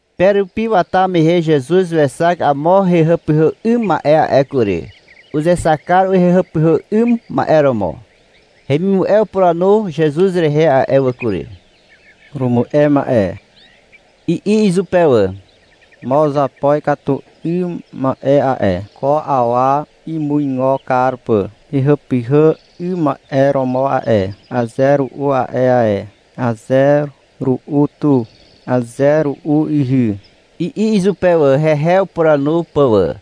Pe rupi wata mehe Zezuz wexak amo hehàpyhà 'ym ma'e a'e kury. Uzexak kar hehàpyhà 'ym ma'e romo. Hemimu'e upuranu Zezuz rehe a'e wà kury. — Purumu'e ma'e, i'i izupe wà. — Mo uzapo ikatu 'ym ma'e a'e, ko awa imuigo kar pà hehàpyhà 'ym ma'e romo a'e. Aze ru'u a'e ae, aze ru'u tu, aze ru'u ihy, i'i izupe wà, hehe upuranu pà wà.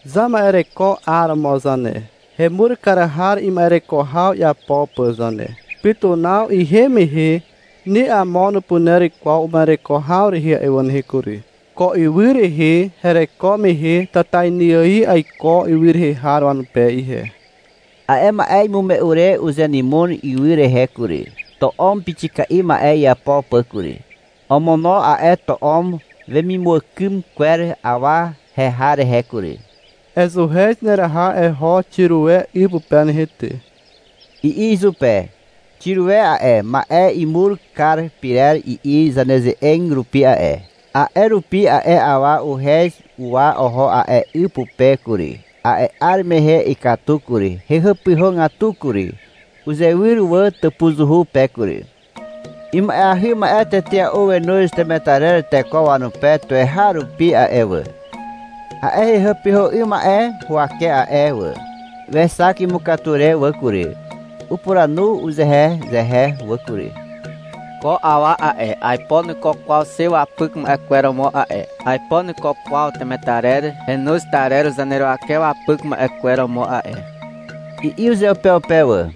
Zama'ereko 'aromo zane, hemur kar har ima'ereko haw iapo pà zane. Pytunaw ihem mehe ni amo nupuner kwaw uma'ereko haw rehe a'e nehe kury. Ko ywy rehe hereko mehe tatainy ài aiko ywy rehe har wanupe ihe. A'e ma'e imume'u re uzenymon ywy rehe kury, to'om pixika'i ma'e iapo pà kury. Omono a'e to'om wemimuàkym kwer awa heha rehe kury. — Ezuhez nereha eho Xirue 'y pupe nehe ty, i'i izupe. (Xirue a'e, ma'e imur kar pyrer i'i zaneze'eg rupi a'e.) A'e rupi a'e awa uhez uwa oho a'e 'y pupe kury. A'e 'ar mehe ikatu kury, hehàpyhàgatu kury. Uzewyr wà tàpuzuhu pe kury. Ima'eahy ma'e tetea'u wenoz temetarer teko wanupe tuweharupi a'e wà, a'e hehàpyhà 'ym ma'e huwake a'e wà. Wexak imukatu re wà kury. Upuranu uzehezehe wà kury. — Ko awa a'e, aipo nuiko kwaw xe wapyk ma'e kwer romo a'e. Aipo nuiko kwaw temetarer henoz tarer zaneruwake wapyk ma'e kwer romo a'e, i'i uzeupeupe wà.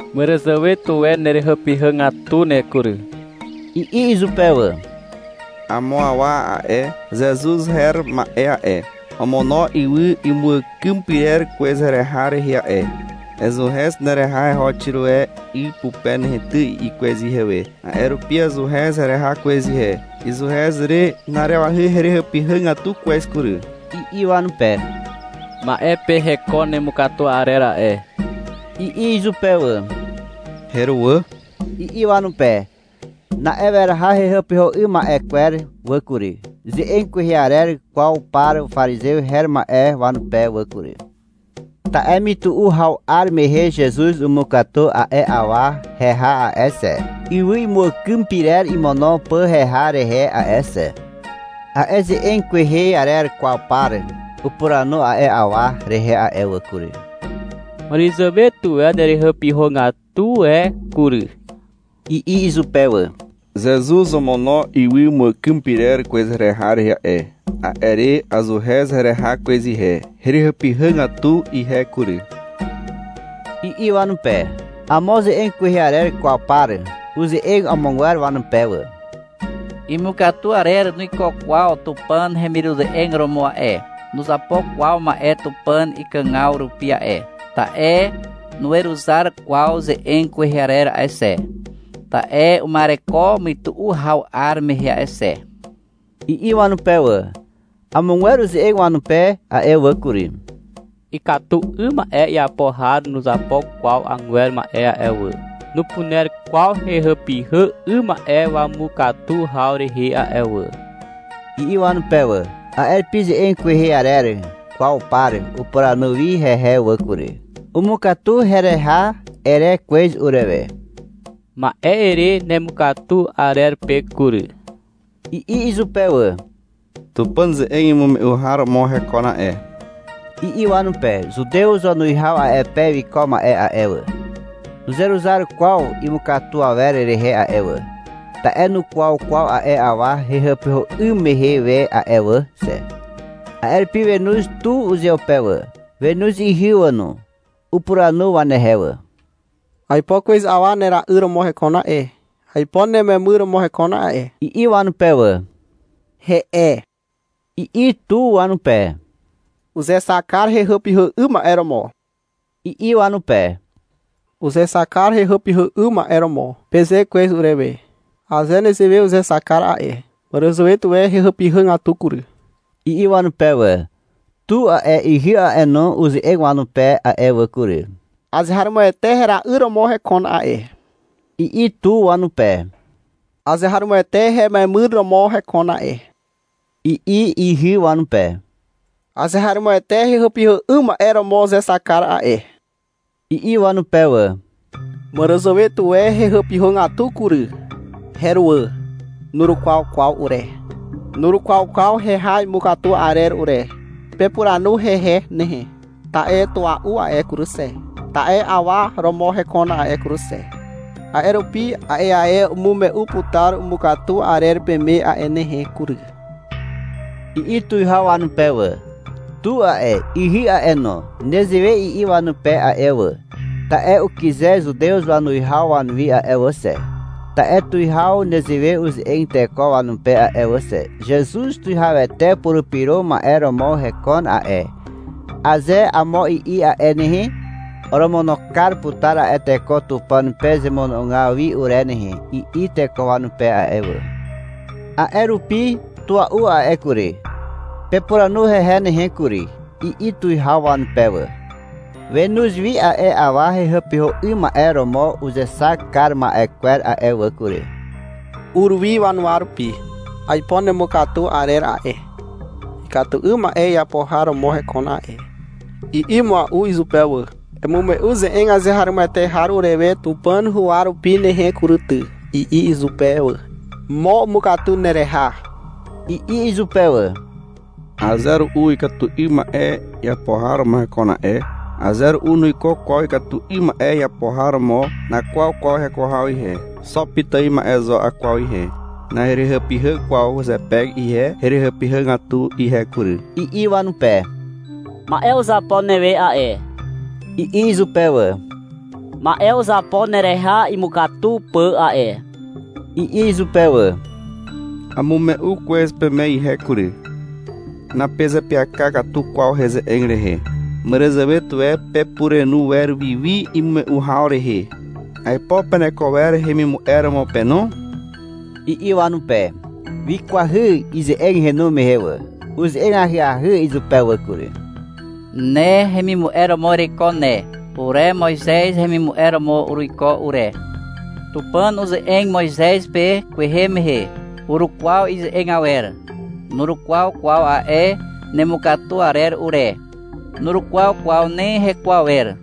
— Màràzàwe tuwe nerehàpyhàgatu ne kury, i'i izupe wà. — Amo awa a'e, Zezuz her ma'e a'e, omono ywy imuàkym pyrer kwez hereha rehe a'e. — Ezuhez nereha eho Xiroe 'y pupe nehe ty, i'i kwez ihewe. A'e rupi azuhez hereha kwez ihe. Izuhez re na'arewahy herehàpyhàgatu kwez kury, i'i wanupe. — Ma'e pe hekon nemukatu arer a'e, i'i izupe wà. — Heruwà, i'i wanupe. Na'e weraha hehàpyhà 'ym ma'e kwer wà kury, ze'eg kwehe arer kwaw par parizew her ma'e wanupe wà kury. Ta'e mytu'u haw 'ar mehe Zezuz umukatu a'e awa heha a'e xe, ywy imuàkym pyrer imono pà heha rehe a'e xe. A'e ze'eg kwehe arer kwaw par upuranu a'e awa rehe a'e wà kury. — Màràzàwe tuwe nerehàpyhàgatu e kury i'i izupe wà. — Zezuz omono ywy imuàkym pyrer kwez hereha rehe a'e, a'e re azuhez hereha kwez ihe. Herehàpyhàgatu ihe kury, i'i wanupe. Amo ze'eg kwehe arer kwaw par uze'eg amogwer wanupe wà. — Imukatu arer nuiko kwaw Tupàn hemiruze'eg romo a'e, nuzapo kwaw ma'e Tupàn ikàgaw rupi a'e, ta'e nuweruzar kwaw ze'eg kwehe arer a'e xe. Ta'e uma'ereko mytu'u haw 'ar mehe a'e xe, i'i wanupe wà. Amogwer uze'eg wanupe a'e wà kury. — Ikatu 'ym ma'e iapo har nuzapo kwaw agwer ma'e a'e wà. Nupuner kwaw hehàpyhà 'ym ma'e wamukatu haw rehe a'e wà, i'i wanupe wà. A'e rupi ze'eg kwehe arer kwaw par upuranu wi hehe wà kury. — Umukatu hereha, ere kwez urewe. Ma'e ere nemukatu arer pe kury, i'i izupe wà. — Tupàn ze'eg imume'u har romo hekon a'e, i'i wanupe. Zutew wanuwihaw a'e pe wiko ma'e a'e wà, nuzeruzar kwaw imukatu awer rehe a'e wà, (ta'e nukwaw kwaw a'e awa hehàpyhà 'ym mehe we a'e wà xe). A'e rupi wenoz tu uzeupe wà, wenoz ihy wà no. Upuranu wanehe wà. — Aipo kwez awa nera'yr romo hekon a'e, aipo nememyr romo hekon a'e, i'i wanupe wà. (-He'e, i'i tu wanupe. Uzexak kar hehàpyhà 'ym ma'e romo, i'i wanupe.) — Uzexak kar hehàpyhà 'ym ma'e romo, peze kwez urewe. Aze nezewe uzexak kar a'e, màràzàwe tuwe hehàpyhàgatu kury, i'i wanupe wà. Tu a'e, ihy a'e no, uze'eg wanupe a'e wà kury. — Azeharomoete hera'yr romo hekon a'e, i'i tu wanupe. — Azeharomoete hememyr romo hekon a'e, i'i ihy wanupe. Azeharomoete hehàpyhà 'ym ma'e romo uzexak kar a'e, i'i wanupe wà. — Màràzàwe tuwe hehàpyhàgatu kury. Heruwà. Nurukwaw kwaw ure. Nurukwaw kwaw heha imukatu arer ure. Pepuranu hehe nehe, ta'e tua'u a'e kury xe, ta'e awa romo hekon a'e kury xe. A'e rupi a'e ae umume'u putar umukatu arer peme a'e nehe kury, i'i tuwihaw wanupe wà. Tu a'e, ihy a'e no, nezewe i'i wanupe a'e wà, ta'e ukyze Zutew wanuwihaw wanuwi a'e wà xe. Ta'e tuwihaw nezewe uze'eg teko wanupe a'e wà xe. — Zezuz Tuwihawete Purupyro Ma'e romo hekon a'e, aze amo i'i a'e nehe, oromono kar putar a'e teko Tupàn pe zemono'ogaw wi ure nehe, i'i teko wanupe a'e wà. A'e rupi — Tua'u a'e kury, pepuranu hehe nehe kury, i'i tuwihaw wanupe wà. Wenoz wi a'e awa hehàpyhà 'ym ma'e romo uzexak kar ma'e kwer a'e wà kury. Ur wi wanuwa rupi. — Aipo nemukatu arer a'e, ikatu 'ym ma'e iapo har romo hekon a'e, i'i mua'u izupe wà. — Emume'u ze'eg azeharomoete har urewe Tupàn huwa rupi nehe kury ty, i'i izupe wà. — Mo umukatu nereha, i'i izupe wà. — Aze ru'u ikatu 'ym ma'e iapo har romo hekon a'e. Aze ru'u nuiko kwaw ikatu 'ym ma'e iapo har romo. Nakwaw kwaw heko haw ihe. Xo pitài ma'e zo akwaw ihe. Naherehàpyhà kwaw zepe ihe. Herehàpyhàgatu ihe kury, i'i wanupe. — Ma'e uzapo newe a'e, i'i izupe wà. — Ma'e uzapo nereha imukatu pà a'e, i'i izupe wà. — Amume'u kwez peme ihe kury, napezeapyaka katu kwaw heze'eg rehe. Màràzàwe tuwe pepurenu wer wiwi imume'u haw rehe. Aipo peneko wer hemimu'e romo pe no, i'i wanupe. (Wikwahy ize'eg henu mehe wà.) Uze'eg ahyahy izupe wà kury. — Ne hemimu'e romo ereiko ne. Ure Moizez hemimu'e romo uruiko ure. Tupàn uze'eg Moizez pe kwehe mehe. Urukwaw ize'eg awer. Nurukwaw kwaw a'e nemukatu arer ure. Nurukwaw kwaw ni heko awer,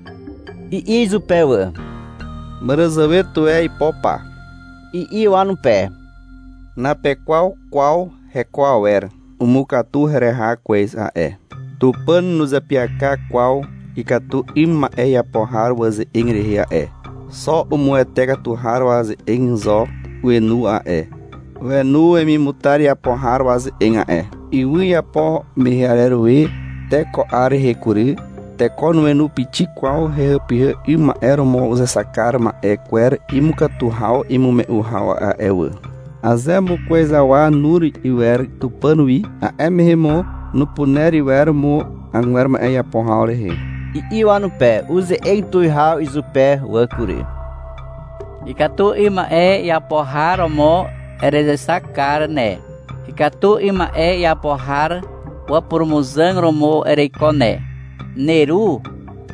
i'i izupe wà. — Màràzàwe tuwe aipo pa, i'i wanupe. — Napekwaw kwaw heko awer. Umukatu hereha kwez a'e. Tupàn nuzeapyaka kwaw ikatu 'ym ma'e iapo har waze'eg rehe a'e. Xo umuwete katu har waze'eg zo wenu a'e. Wenu wemimutar iapo har waze'eg a'e. Ywy iapo mehe arer we te ko 'ar rehe kury, teko nuenu pixik kwaw hehàpyhà 'ym ma'e romo uzexak kar ma'e kwer imukatu haw imume'u haw a'e wà. Aze mo kwez awa nur iwer Tupàn wi, a'e mehe mo nupuner iwer mo agwer ma'e iapo haw rehe, i'i wanupe. Uze'eg tuwihaw izupe wà kury. — Ikatu 'ym ma'e iapo har romo erezexak kar ne. Ikatu 'ym ma'e iapo har wapurumuzàg romo ereiko ne. Neru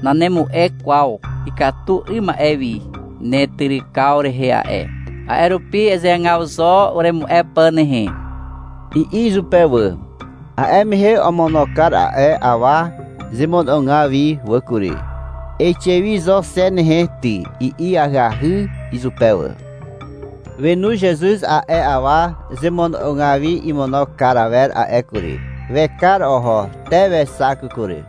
nanemu'e kwaw ikatu 'ym ma'e wi netyrykaw rehe a'e. A'e rupi ezeagaw zo uremu'e pà nehe, i'i izupe wà. A'e mehe omono kar a'e awa zemono'ogaw wi wà kury. — Eixe wi zo xe nehe ty, i'i ahyahy izupe wà. Wenu Zezuz a'e awa zemono'ogaw wi imono kar awer a'e kury. Wekar oho. Te wexak kury.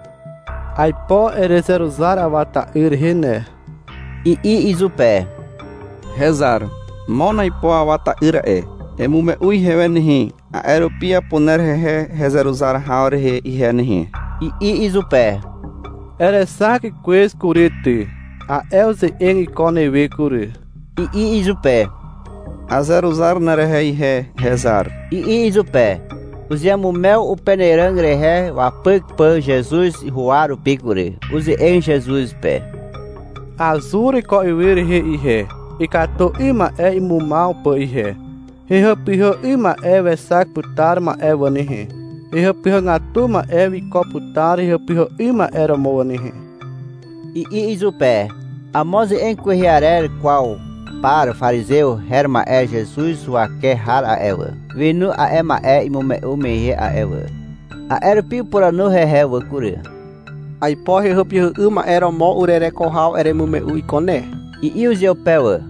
— Aipo erezeruzar Awa ta'yr rehe ne, i'i izupe. — Hezar, mon aipo awa ta'yr a'e, emume'u ihewe nehe, a'e rupi apuner hehe hezeruzar haw rehe ihe nehe, i'i izupe. — Erexak kwez kury ty. A'e uze'eg iko newe kury, i'i izupe. — Azeruzar nerehe ihe, hezar, i'i izupe. Uzeamumew upenàràg rehe wapyk pà Zezuz huwa rupi kury. Uze'eg Zezuz izupe. — Azur ko ywy rehe ihe, ikatu 'ym ma'e imumaw pà ihe. Hehàpyhà 'ym ma'e wexak putar ma'e wà nehe. Hehàpyhàgatu ma'e wiko putar hehàpyhà 'ym ma'e romo wà nehe, i'i izupe. Amo ze'eg kwehe arer kwaw par parizew her ma'e Zezuz huwake har a'e wà, wenu a'e ma'e imume'u mehe a'e wà. A'e rupi upuranu hehe wà kury. — Aipo hehàpyhà 'ym ma'e romo urereko haw eremume'u iko ne, i'i izupe wà.